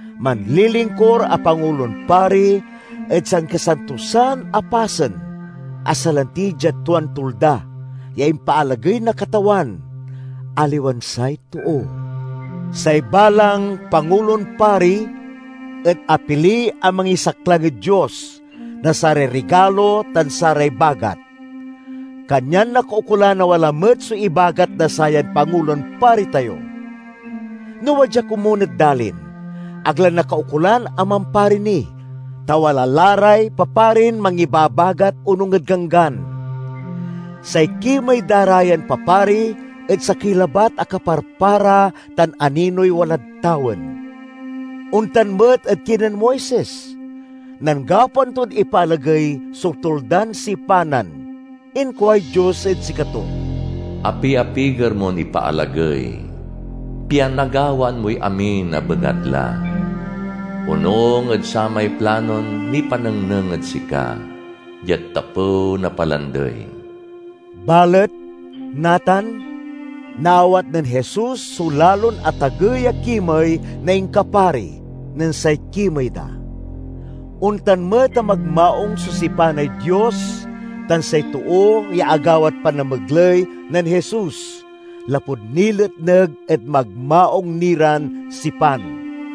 Manlilingkur a Pangulon Pari ed Sankasantosan a Pasen, a salanti diad tuan tulda ya impaalagey na Katawan, aliwan say too. Say balang Pangulon Pari et apili a mangisaklang ed Dios na saray rigalo tan saray bagat, kanyan nakaukolan a wala met so ibagat na sayan Pangulon Pari tayo. No wadya komun ed dalin, ag la nakaukolan a mampari ni, ta wala la ray paparin mangibabagat onung ed Ganggan. Say kimey da ra yan papari et sakey labat a kaparpara tan aninoy walad tawen. Ontan met ed kinen Moises; nen gapoan ton ipaalagey so Tuldan Sipanan, inkuay Dios ed sikato, "Apiapiger mon ipaalagey, pian nagawaan moy amin a bengatla onung ed samay planon nipanengneng ed sika diad tapew na palandey." Balet, natan, naawat nen Jesus so lalon atagey a kimey na inkapari nen say kimey da. Ontan met a magmaung so sipanay Dios tan say too ya agawad panamegley nen Jesus, lapud niletneg ed magmaung ni ran sipan.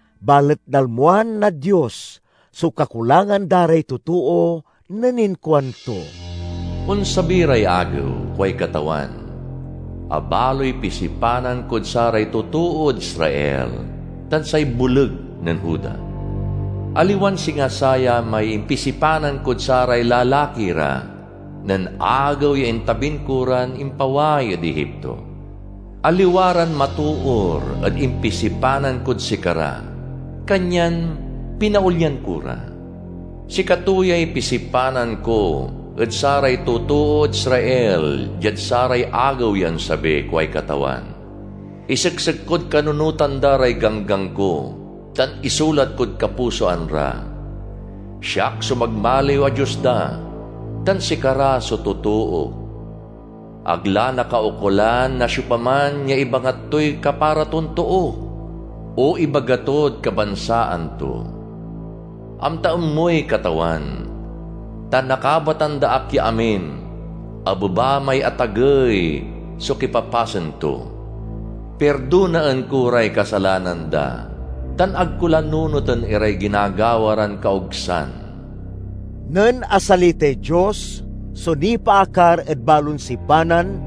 Balet nalmoan na Dios so kakulangan da ray totoo nen inkuanto, "Onsabi ray agew, kuay Katawan, a baloy pisipanan kod saray totood Israel tan say boleg nen Juda. Aliwan singa saya may impisipanan kod saray lalaki ra, nen agew ya intabin ko ran impaway ed Egipto. Aliwa ran matoor ed impisipanan kod sikara, kanyan pinaolyan ko ra. Sikato yay pisipanan ko ed saray totood Israel diad saray agew ya onsabi, kuay Katawan: Iseksek kod kanunotan da ray ganggan ko tan isulat kod kapusoan ra. Siak so magmaliw a Dios da, tan sikara so totook. Ag la nakaukolan na siopaman ya ibangat toy kapara ton too o ibaga tod kabansaan to, 'Amtaen moy Katawan.' Ta nakabatan da ak ya amin, abeba may atagey so kipapasen to. Pirdonaen ko ray kasalanan da tan ag ko la nunoten iray ginagawa ran kaogsan." Nen asalitay Dios so nipaakar ed balon sipanan,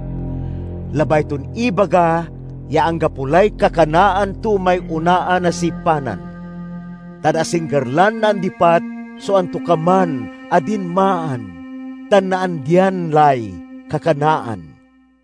labay ton ibaga ya anggapo lay kakanaan to may onaan a sipanan; tan asingger lan naandipat so antokaman a dinmaan tan naandian lay kakanaan.